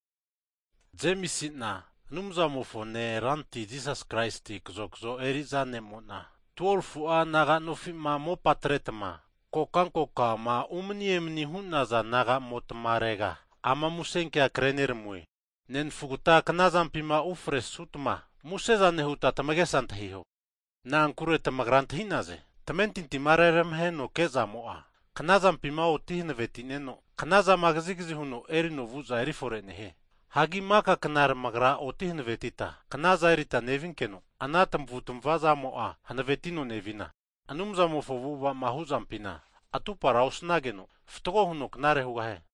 Hagi Jemisi'na Anumzamofone Ranti Jisas Kraisi kazokzo eri'za ne'mo'na, 12fu'a naga'nofi'ma mopa atretma kokankokama umani emani hu'naza nagamotarega, ama avona kreneramue. Nenafugta knazampima ufresutma, muse zane hutma tamagesa antahiho. Na'ankure tamagra antahi'naze, tamentintima reramaheno ke'zamo'a, knazampima oti hankavetineno, knazama kazigazi huno erino vu'za erifore nehie. Hagi maka kna tamagra oti hanavetita, knazana erita nevinkeno, ana tamavutmavazamo'a hanavetino nevina, Anumzamofo avu'ava'ma huzampina, atupara osnageno, fatgo huno knare hugahie.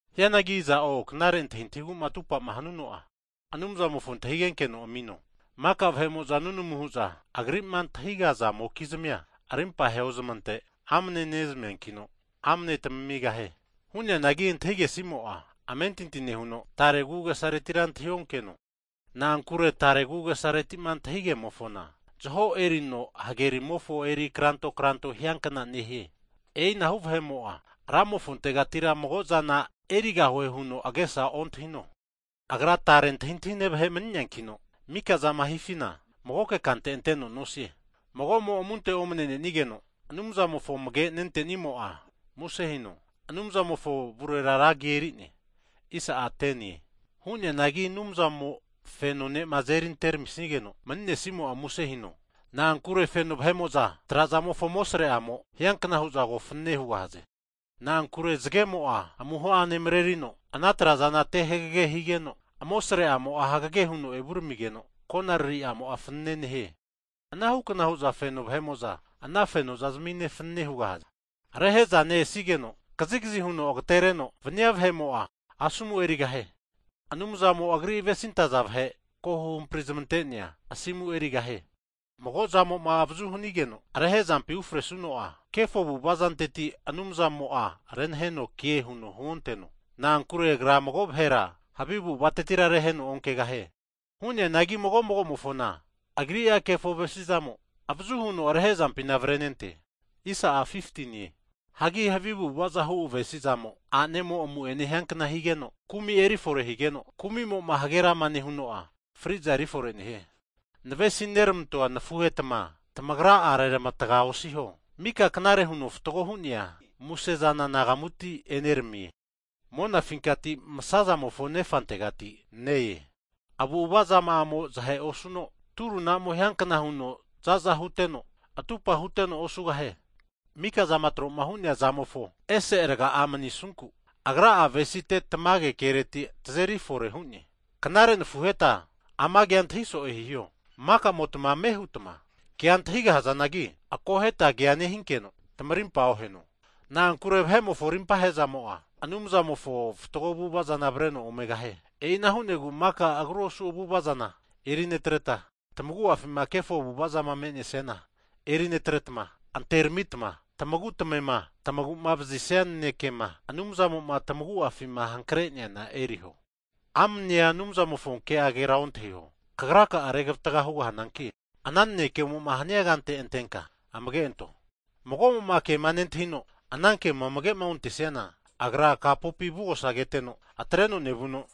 Hianagi iza'o knare antahintahigu'ma atupama hanuno'a, Anumzamofo antahigenkeno amino, maka vahe'mo'za nunamu hu'za Agri'ma antahigazamokizmia, rimpa heozmante amne nezmiankino, amne tamigahie. Hu'neanagi antahigesimo'a, amentinti nehuno tare agu'agesaretira antahionkeno, na'ankure tare agu'agesareti'ma antahigemofona, zaho erino hage rimomofo eri kranto kranto hiankna nehie. E'inahu vahe'mo'a Ramofontegati mago'zana erigahue huno agesa ontahino, agra tare antahintahine vahe mani'neankino, mika zama hifina magoke kante anteno nosie. Hagi mago'mo amunte omne'nenigeno, Anumzamofo amage nentenimo'a muse hino, Anumzamofo avurera ra agi erine. Hu'neanagi Anumzamo feno ne'ma azeri anteramisigeno mani'nesimo'a musehino. Na'ankure feno vahe'mo'za trazamofo amosre'amo hianka hu'za ko fanane hugahaze. Na'ankure zagemo'a amuho'ane marerino, ana trazana te hagage higeno, amosre'amo'a hagage huno evuramigeno, konariri'amo'a fanane nehie. Anahukna hu'za feno vahe'mo'za, ana fenozmine fanane hugahaze. Hagi Rehe'za ne-esigeno kazigazi huno agatereno vania vahe'mo'a asomu'ma erisiana, kini fetori eriankna huno manivava asimura erigahie. Anumzamo'a agri'ma avesinentaza vahe ko huhampri zamante'nea, asimu erigahie. Mago zamo'ma avazu hanigeno rehezampima ufresuno'a, kefo avu'avazanteti Anumzamo'a renahenoke huno huonteno, na'ankure Agra mago vahera havi avu'avatetira reheno onkegahie. Hu'neanagi mago magomofona agri'a kefo avesi'zamo, avazu huno rehezampina avarenente. Hagi havi avu'avazahu avesi'zamo, a'nemo amu'ene hiankna higeno, kumi erifore higeno, kumi'mo hagerama nehuno'a, fri'za eri fore nehie. Navesineramantoa nafuhetma tamagra'a reramatga osiho. Mika knare huno fatgo hu'nea, musezana anagamuti eneramie, monafinkati masazamofo Nefantegati ne-ea, avu'avazama'amo zahe osuno turunamo hiankna huno zaza huteno, atupa huteno osugahie. Mika'zama tro'ma hu'nea zamofo ese raga'a manisunku, Agra'a avesite tamage kereti tazeri fore hu'ne. Hagi knare nafuheta, ama kea antahi so'e hiho, mika'motma ame hutma kea antahigahazanagi, akoheta kea nehinkeno tamarimpa oheno. Na'ankure vahe'mofo rimpa he'zamo'a, Anumzamofo fatgo avu'ava zana avreno omegahie. E'ina hu'negu mika agru osu avu'ava zana erinetreta, tamagu'afima kefo avu'avazama me'nesiana erinetretma, anteramitma, tamagu tamema tamaguma vazisia nanekema Anumzamo'ma tamagu'afima hankre'neana eriho. Amnea Anumzamofo Ke'agera ontahio, kagraka'a regavatga hugahananki, ana nanekemoma hania kante antenka amage anto. Mago'mo'ma kema nentahino, ana kema amage'ontesiana, agra kapopi avugosa keteno, atreno nevuno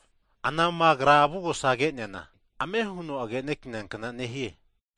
anama agra avugosa ke'neana, ame huno agenekania kna nehie.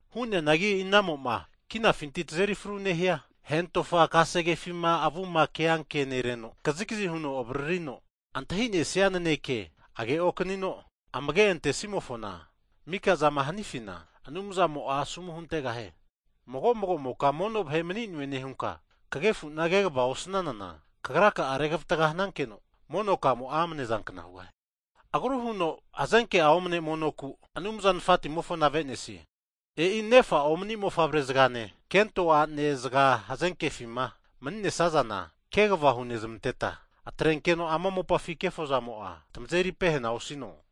Hu'neanagi, inamo'ma kinafinti tazeri fru nehia, hentofa kasegefima avuma ke ankenereno, kazigazi huno avaririno antahi'nesia naneke age'okanino amage'antesimofona, mika'zama hanifina Anumzamo'a, asomu huntegahie. Mago'moka mono vahe'mani'noe nehunka kagefu'na kegava osnanana, kagra'a regavatga hanankeno mono kamo'a amnezankna hugahie. Agru huno fatgo monoku'ma Anumza Nafatimofona ave'nesiana, e'i megusa mofavre'zagane, kento a'ne zaga knazampima mani'nesazana kegava hunezmanteta, atrenkeno ama mopafi kefozamo'a tamazeri pehena osino.